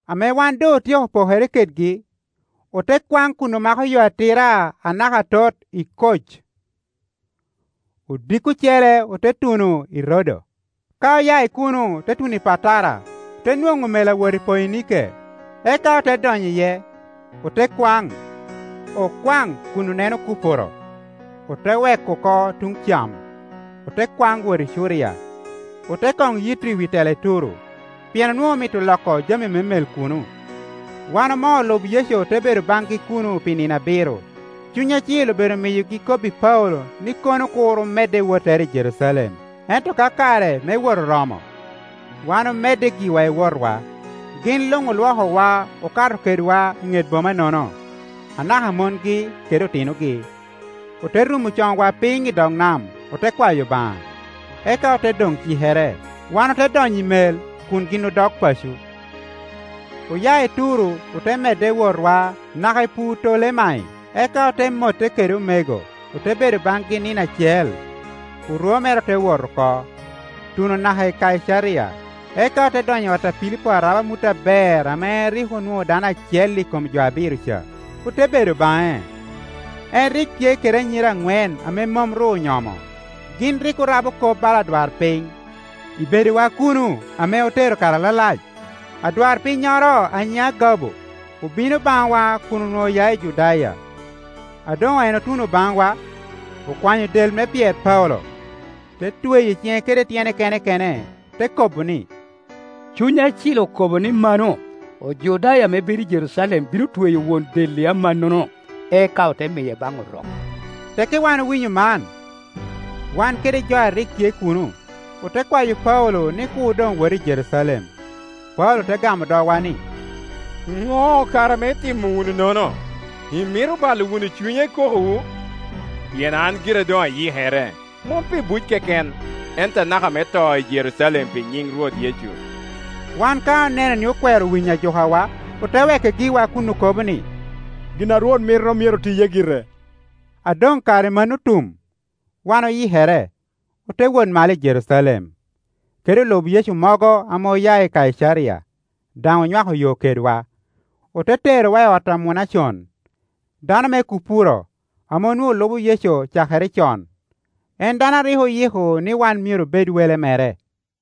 Ame wan doŋotyeko pokere kedgi, ote kwaŋ kun omako yo atira anaka atot i Koc. Odiko ocele ote tuno i Rodo, ka oya i kuno otuno i Patara. Ote nwoŋo mel ame awot i Poinike, eka ote donyo iye, ote kwaŋ. Okwaŋ kun oneno Kupuro, ote weko oko tuŋ cam, ote kwaŋ wot i Curia; ote koŋ yito i wi tela i Turo, pien onwoŋo omito loko jami me mel kuno. Wan omoo olub Yecu ote bedo baŋgi kuno pi nino abiro. Cuny Acil obedo miyogi kobbi Paulo ni kono kur omedde i wottere i Jerucalem. Ento ka kare me wot oromo, wan omedde giwa i wotwa. Gin luŋolwokowa okato kedwa i ŋet boma-nono, anaka mongi kede otinogi. Ote rumo coŋwa piny i dog nam, ote kwayo Obaŋa. Eka ote doŋcikere. Wan ote donyo i mel kun gin odok paco. Oya i Turo ote medde i wotwa naka i Putolemai, eka ote motte kede omego, ote bedo baŋgi nino acel. Orwo mere ote wot oko, tuno naka i Kaicaria, eka ote donyo i ot a Pilipo arab amut aber ame en rik onwoŋo dano acel i kom jo abiro ca, ote bedo baŋe. En rik tye kede anyira aŋwen ame mom ru onyomo, gin rik orabo kop bala odwarpiny. I bedowa kuno ame otero kare alalac, adwarpinnyoro a nyine Agabo obino baŋwa kun onwoŋo oya i Judaya. A doŋen otuno baŋwa, okwanyo del me pyer Paulo, te tweyo i ciŋe kede tyene kene kene, te kobo ni, “Cuny Acil okobo ni mano, ‘Ojudaya ame bedo i Jerucalem bino tweyo won del-li amannono, eka ote miye baŋ Orok.’” Tekki wan owinyo man, wan kede jo a rik tye kuno, ote kwayo Paulo ni kur doŋwot i Jerucalem. Paulo te gamo dogwa ni, “Do kara ame itimo wununono, imito balo wunu cunya i kokowu? Pien an gira doŋ ayikere, mom pi buc keken, ento anaka me to i Jerucalem pi nyiŋ Rwot Yecu.” Wan ka oneno ni okwero winyo ajukawa, ote weke giwa kun okobo ni, “Gin a Rwot mito myero tiye gire.” A doŋ kare mano otum, wan oyikere, ote wot malo i Jerucalem. Kede olub Yecu mogo ame oya i Kaicaria daŋ onywako yo kedwa, ote terowa i ot a Munacon, dano me Kupuro, ame onwoŋo lubo Yecu cakere con, en dano a rik oyiko ni wan myero obed wele mere.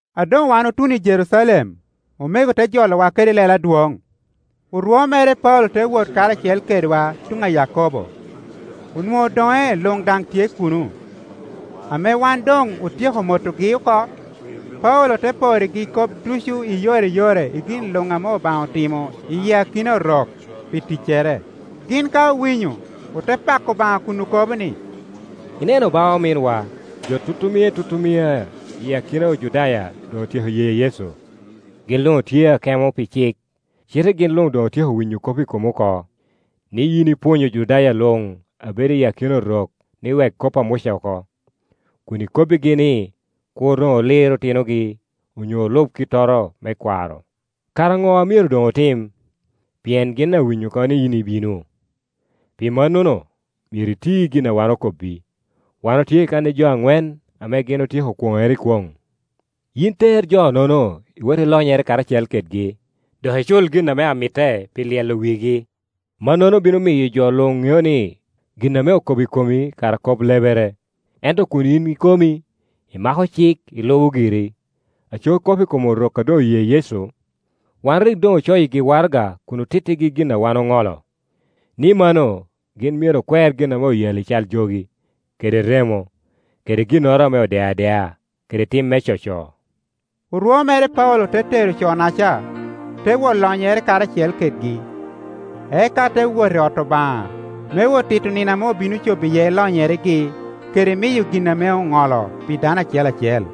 A doŋ wan otuno i Jerucalem omego te jolowa kede lelo adwoŋ. Orwo mere Paulo te wot karacel kedwa tuŋ a Yakobo; onwoŋo odoŋe luŋ daŋ tye kuno. Ame wan doŋ otyeko motogi oko, Paulo te porrigi kop ducu i yore i yore i gin luŋ ame Obaŋa otimo i akina Orok pi ticcere. Gin ka owinyo, ote pako Obaŋa, kun okobo ni, “Ineno ba, ominwa, jo tutumia i tutumia i akina Ojudaya doŋ otyeko ye Yecu. Gin luŋ otye akemo pi cik, cite gin luŋ doŋ otyeko winyo kop i komi oko, ni yin ipwonyo Ojudaya luŋ a bedo i akina Orok ni wek kop a Muca oko, kun ikobbigi ni, kur doŋ olir otinogi onyo olub kittoro me kwaro. Kara Ŋo a myero doŋotim? Pien gin awinyo oko ni yin ibino. Pi mannono myero iti gin a wan okobbi. Wan otye kan i jo aŋwen ame gin otyeko kwoŋŋere i kwoŋ. Yin ter jo-nono iwot ilonyere karacel kedgi, dok icul gin ame mitte pi lyelo wigi. Mannono bino miyo jo luŋ ŋeo ni gin ame okobo i komi kara kop lebere, ento kun yin ikomi imako cik ilubo giri. Aco kop i kom Orok a doŋ oye Yecu, wan rik doŋ ocoyigi waraga kun otittigi gin a wan oŋolo, ni mano gin myero okwer gin ame oyalli cal jogi, kede remo, kede ginnoro ame odeo adea, kede tim me coco.” Orwo mere Paulo te tero co-naca, te wot lonyere karacel kedgi, eka te wot i ot Obaŋa me wot tito nino ame obino cobo iye lonyeregi kede miyo gin ame oŋolo pi dano acel acel.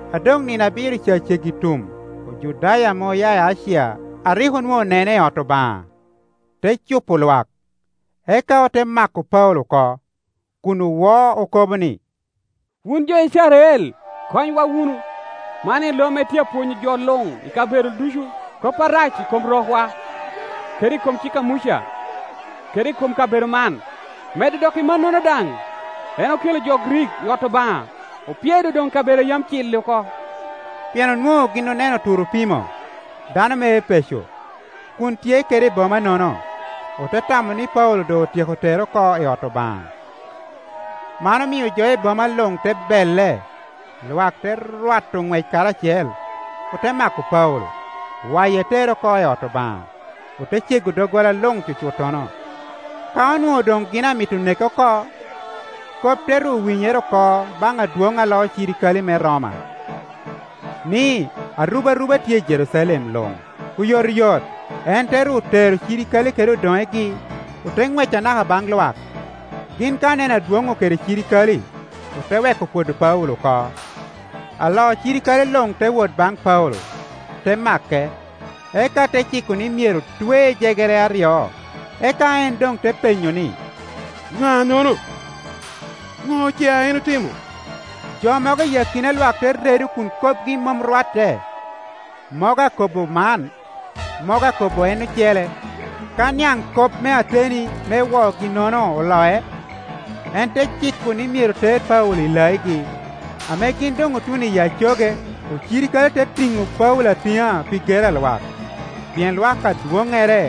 A doŋnino abiro ca ceggi tum, Ojudaya ame oya i Acia, a rik onwoŋo onene i ot Obaŋa, te cupo lwak, eka ote mako Paulo oko, kun owo okobo ni, “Wun jo Icrael, konywa wunu! Man en lo ame tye apwonyo jo luŋ i kabedo ducu kop arac i kom rokwa, kede i kom cik a Muca, kede i kom kabedo man. Medo dok i mannono daŋ, en okelo jo Grik i ot Obaŋa, opyedo doŋ kabedo a yam cil-li oko,” Pien onwo Ŋo gin oneno Turopimo, dano me Epeco, kun tye kede i boma-nono, ote tamo ni Paulo doŋ otyeko tere oko i ot Obaŋa. Man omio jo i boma luŋ te belle, lwak te rwato ŋwec karacel; ote mako Paulo, waye tere oko i ot Obaŋa, ote cego doggola luŋ cucuttono. Ka onwoŋo doŋ gin amito neke oko, kop te ru winyere oko baŋ adwoŋ a loo cirikale me Roma, ni, arubaruba tye i Jerucalem luŋ. Oyotoyot, en te ru tero cirikale kede odoŋegi, ote ŋwec anaka baŋ lwak. Gin ka oneno adwonŋu kede cirikale, ote weko pwodo Paulo oko Alo cirikale luŋ te wot baŋ Paulo, te make, eka te ciko ni myero twe i jegere aryo. Eka en doŋ te penyo ni, “Ŋa-nono? Ŋo ce a en otimo?” Jo mogo i akina lwak te redo kun kopgi mom rwatte, mogo akobo man, mogo akobo en ocele. Ka niaŋ kop me ateni me woogi-nono oloc, en te ciko ni myero ter Paulo i laigi. Ame gin doŋ otuno i acoge, ocirikale te tiŋo Paulo atiŋa pi gero a lwak; pien lwak adwoŋŋere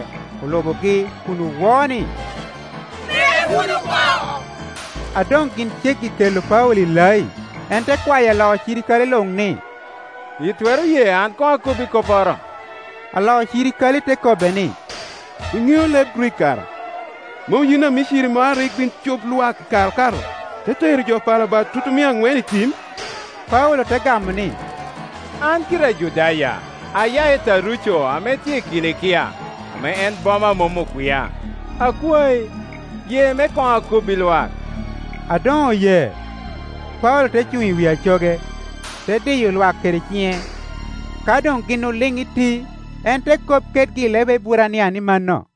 olubogi kun owo ni, “Neke wunu oko!” A doŋ gin ceggi kelo Paulo i lai, en te kwayo alo cirikale luŋ ni, “Itwero ye an koŋ akobbi kopporo?” Alo cirikale te kobbe ni “Iŋeo leb Grik kara? Mom yin a Miciri moro a rik bin cup lwak i kare okato, te tero jo Pala Bat tutumia aŋwen i tim?” Paulo te gamo ni, “An gira Ajudaya, aya i Taruco ame tye i Kilikia, ame en boma a mom okwia. Akwayi, ye me koŋ akobbi lwak.” A doŋ oye, Paulo te cuŋ i wi acoge, te diyo lwak kede ciŋe. Ka doŋ gin oliŋ iti, en te kop kedgi i leb Eburania ni mano,